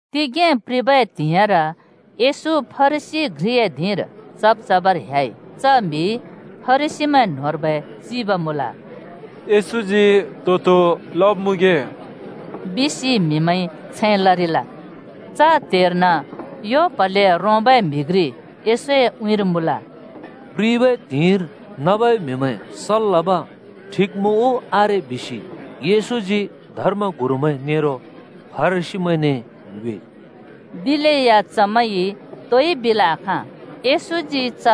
तिगें प्रिबै त्हिंइर येशू फरिसी घ्रिए धिंर चब् चबर ह्‍याइ। च म्‍हि फरिसीमैं न्‍होंर्बै चिब मुँल। “येशूजी तो-तो लमगे?” बिसि म्हिमैंइ छैं लरिल। च त्‍हेर्न यो प्‍हले रोंबै म्‍हि घ्रि येशूए उँइँर मुँल। “प्रिबै त्हिंइर नबै म्हिमैं सल् लब ठिक मुँ उ आरे? बिसि येशूजी धर्मगुरुमैं नेरो फरिसीमैंने ङ्योएइ।” दिलेया चमैंइ तोइ बिल् आखाँ। येशूजी च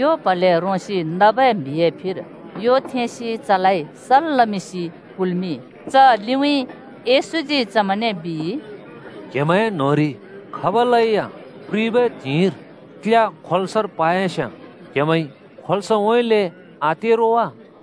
यो प्हले रोंसि नबै म्‍हिए फिर यो थेंसि चलाइ सल् लमिंसि कुल्मिंइ। च लिउँइँ येशूजी चमैंने बिइ, “क्‍हेमैं न्‍होंरि खबलैया प्रिबै त्हिंइर क्‍ल्‍या खोल्‍सर पायस्‍याँ क्हेमैंइ खोल्सउँइँले आते रो वा?”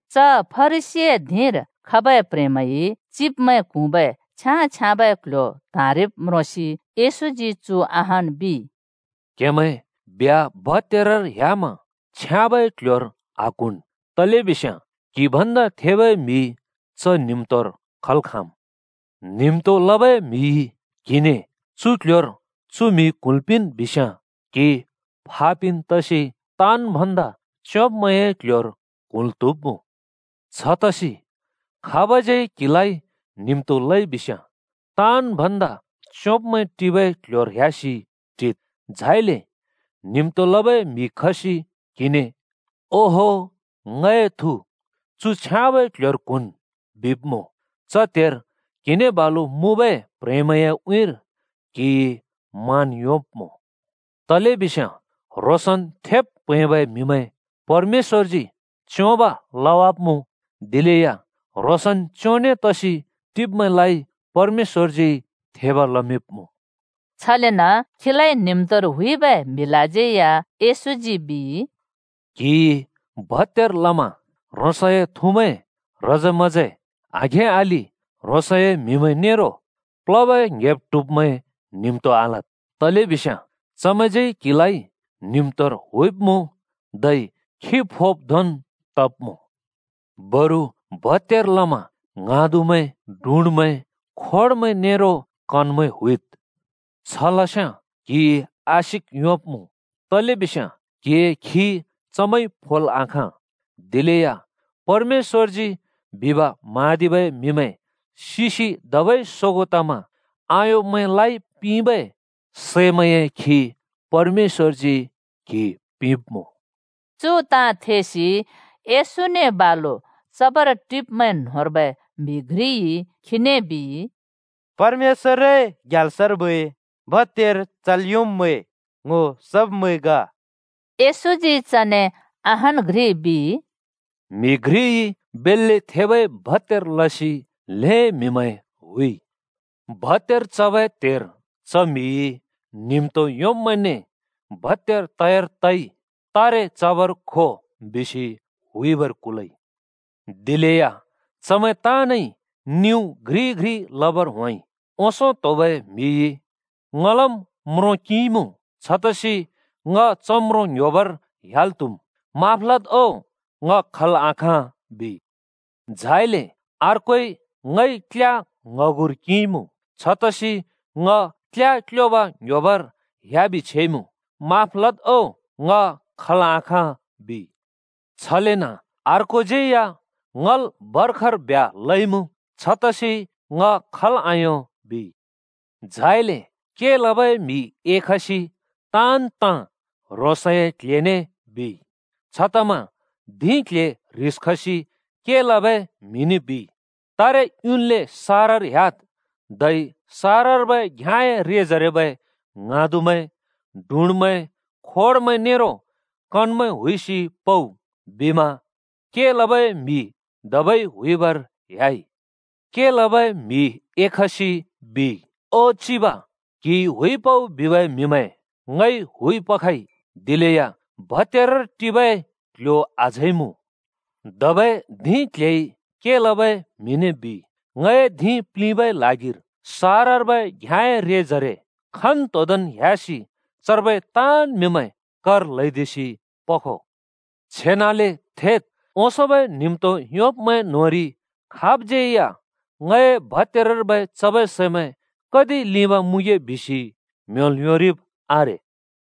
च फरिसीए धिंर खबै प्‍ह्रेंमैंइ चिब्मैं क्हुँबै छ्याँ-छ्याँबै क्‍ल्‍ह्‍यो त्‍हाँरिब् म्रोंसि येशूजी चु अहान् बिइ, “क्हेमैं ब्ह्‍या भत्‍यारर ह्‍यामा छ्याँबै क्‍ल्‍ह्‍योर आक्हुँन्, तलेबिस्याँ क्‍हि भन्दा थेबै म्‍हि च न्हिम्तोर खल् खाँम्। न्हिम्तो लबै म्‍हिइ क्‍हिने ‘चु क्‍ल्‍ह्‍योर चु म्‍हि क्हुँल् पिंन् बिस्याँ’ क्‍हि फापिन् तसि ताँन् भन्दा च्योंब्मैंए क्‍ल्‍ह्‍योर क्हुँल् त्‍हुब्मुँ। छतसि खाबज्यै क्हिलाइ न्हिम्तो लइ बिस्याँ ताँन् भन्दा च्योंब्मैं टिबै क्‍ल्‍ह्‍योर ह्‍यासि टिद्। झाइले न्हिम्तो लबै म्‍हि खसि क्हिने ‘ओहो, ङए थु, चु छ्याँबै क्‍ल्‍ह्‍योर क्हुँन्’ बिब्मुँ, च त्हेर क्हिने बालु मुँबै प्‍ह्रेंमैंए उँइँर क्‍हिइ मान योंब्‍मुँ। तलेबिस्याँ ह्रोंसन् थेब् प्‍हैंबै म्हिमैं परमेश्‍वरजी च्‍योंब लवाब्‍मुँ, दिलेया ह्रोंसन् च्‍योंने तसि टिब्मैंलाइ परमेश्‍वरजी थेब लमिंब्‍मुँ।” छलेन खीलाइ न्हिम्तोर हुइबै म्‍हिलाज्यै या येशूजी बिइ, “क्‍हिइ भत्‍यार लमा ह्रोंसए थुमैं, ह्रजे-म्‍हजे, आघें-अलि ह्रोंसए म्‍हिमैं नेरो प्‍ल्होबै ङ्‌हेब-ट्हुब्मैं न्हिम्तो आलद्, तलेबिस्याँ चमैंज्यै क्‍हिलाइ न्हिम्तोर हुइब्‍मुँ, धै खि फोब् धोंन् तब्‍मुँ। बरु भत्‍यार लमा ङ्हाँदुमैं, डुँडामैं, खोडमैं नेरो कन‍मैं हुइद्। छ लस्याँ क्‍हिइ आशिक योंब्‍मुँ। तलेबिस्याँ क्‍हिए खि चमैंइ फोल् आखाँ। दिलेया परमेश्‍वरजी बिब म्हाँदिबै म्हिमैं सिसि धबै सोगों तमा आयोंब्मैंलाइ पिंबै सैमैंए खि परमेश्‍वरजी क्‍हि पिंब्‍मुँ।” चु ताँ थेसि येशूने बालु चबर टिब्मैं न्होंर्बै म्‍हि घ्रिइ खीने बिइ, “परमेश्‍वरए ग्याल्सर्बै भत्‍यार चल् योंब्‍मैं ङ्‍हो सब्मैं ग!” येशूजी चने अहान् घ्रि बिइ, “म्‍हि घ्रिइ बेल्‍ले थेबै भत्‍यार लसि ल्‍हें म्‍हिमैं हुइ। भत्‍यार चबै त्‍हेर च म्‍हिइ न्हिम्तो योंब्‍मैंने ‘भत्‍यार तयार तइ तारे चबर खो’ बिसि हुइबर कुलइ। “दिलेया चमैं ताँनइ निउ घ्रि-घ्रि लबर होंइ। ओंसों त्‍होबै म्‍हिइ ‘ङलम् म्रों किंइमुँ छतसि ङ च म्रों ङ्ह्‍योबर ह्‍याल् त्हुम्। माफ लद् ओ ङ खल् आखाँ,’ बिइ। झाइले अर्कोइ ‘ङइ क्‍ल्या ङ्‌हगुर किंइमुँ, छतसि ङ क्‍ल्‍या क्योब ङ्ह्‍योबर ह्‍याबि छेइमुँ। माफ लद् ओ ङ खल् आखाँ,’ बिइ। छलेन अर्कोज्यै या ‘ङल भर्खर ब्ह्‍या लइमुँ, छतसि ङ खल् आयों,’ बिइ। “झाइले के लबै म्हि एखसि ताँन् ताँ ह्रोंसए क्‍ल्‍हेने बिइ, छतमा धिं क्‍ल्‍हे ह्रिस खसि के लबै म्हिने बिइ, ‘तारे युन्ले सहरर ह्‍याद् धै सहरर्बै घ्‍याँए रेजरेबै ङ्हाँदुमैं, डुँडामैं, खोडमैं नेरो कन‍मैं हुइसि पउ,’ बिमा के लबै म्हि धबै हुइबर ह्‍याइ। “के लबै म्हि एखसि बिइ, ‘ओ चिब, क्‍हिइ हुइ पउ बिबै म्‍हिमैं ङइ हुइ पखइ। दिलेया भत्‍यारर टिबै क्‍ल्‍ह्‍यो अझै मुँ।’ “धबै धिं क्‍ल्‍हेइ के लबै म्हिने बिइ, ‘ङए धिं प्‍लिंबै ल्हागिर सहरर्बै घ्याँए रेजरे खन्तोंदोंन् ह्‍यासि चर्बै ताँन् म्हिमैं कर ल्‍हैदिसि पखो। छेनाले थेद्! ओंसोंबै न्हिम्तो योंब्‍मैं न्‍होंरि खाबज्‍यै या ङए भत्‍यारर्बै चबै सैमैं कति लिंब मुँगे बिसि म्‍ह्‍योंल् योंरिब् आरे।’”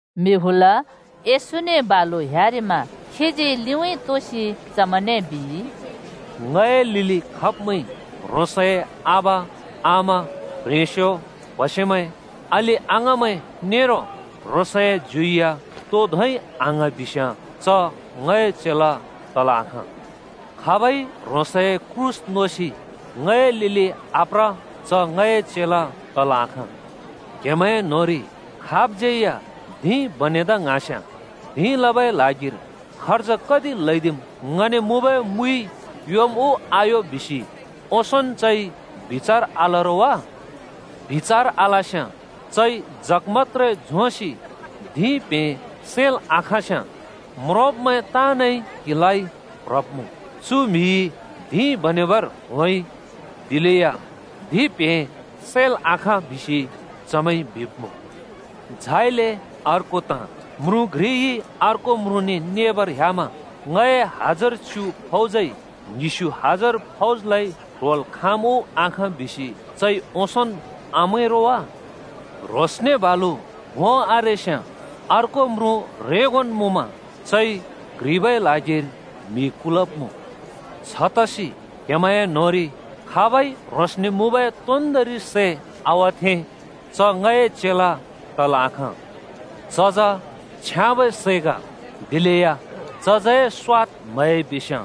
म्‍हि हुल येशूने बालु ह्‍यारिमा खीजी लिंउँइँ तोसि चमैंने बिइ, “ङए लिलि खब्मैंइ ह्रोंसए आबा, आमा, प्ह्रेंस्यो, प्‍हसेमैं, अलि-अङाँमैं नेरो ह्रोंसए ज्यु या तो धोंइ आङ्हाँ बिस्याँ च ङए चेला तल् आखाँ। खाबइ ह्रोंसए क्रूस नोसि ङए लिलि आप्र च ङए चेला तल् आखाँ। “क्‍हेमैं न्‍होंरि खाबज्‍यै या धिं बनेदा ङ्हाँस्‍याँ ‘धिं लबै ल्हागिर खर्ज कति ल्‍हैदिम्? ङने मुँबै मुइइ योम् उ आयो?’ बिसि ओंसोंन् चइ बिचार आल रो वा? बिचार आलस्‍याँ चइ जग मत्‍त्रे झोंसि धिं प्हें सैल् आखाँस्‍याँ म्रोंब्मैं ताँनइ क्हिलाइ प्‍‍ह्रब्मुँ। ‘चु म्‍हिइ धिं बनेबर होंइ दिलेया धिं प्हें सैल् आखाँ बिसि चमैंइ,’ बिब्मुँ। “झाइले अर्को ताँ: म्रुँ घ्रिइ अर्को म्रुँने नेबर ह्‍यामा ‘ङए हजार च्‍यु फौजइ ङ्हिस्‍यु हजार फौजलाइ ट्‍होल् खाँम् उ आखाँ बिसि चइ ओंसोंन् आमैं रो वा?’ ह्रोंसने बालु भों आरेस्‍याँ अर्को म्रुँ ह्रेंगोन् मुँमा चइ क्‍ह्रिबै ल्हागिर म्‍हि कुलब्मुँ। छतसि क्हेमैंए न्होंरि खाबइ ह्रोंसने मुँबै तोन्दोंरि सै आवथें च ङए चेला तल् आखाँ। “चज छ्याँबै सै ग, दिलेया चजए स्‍वाद म्हयाइ बिस्‍याँ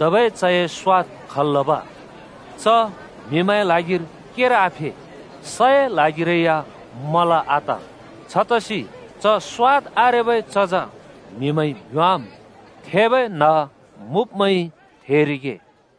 धबै चए स्‍वाद तो सैइ खल् लब? च म्हिमैंए ल्हागिर केर आफे सए ल्हागिरै या मला आत। छतसि च स्‍वाद आरेबै चज म्हिमैंइ भ्‍योंवाम्। “थेबै न्ह मुँब्मैंइ थेरिगे।”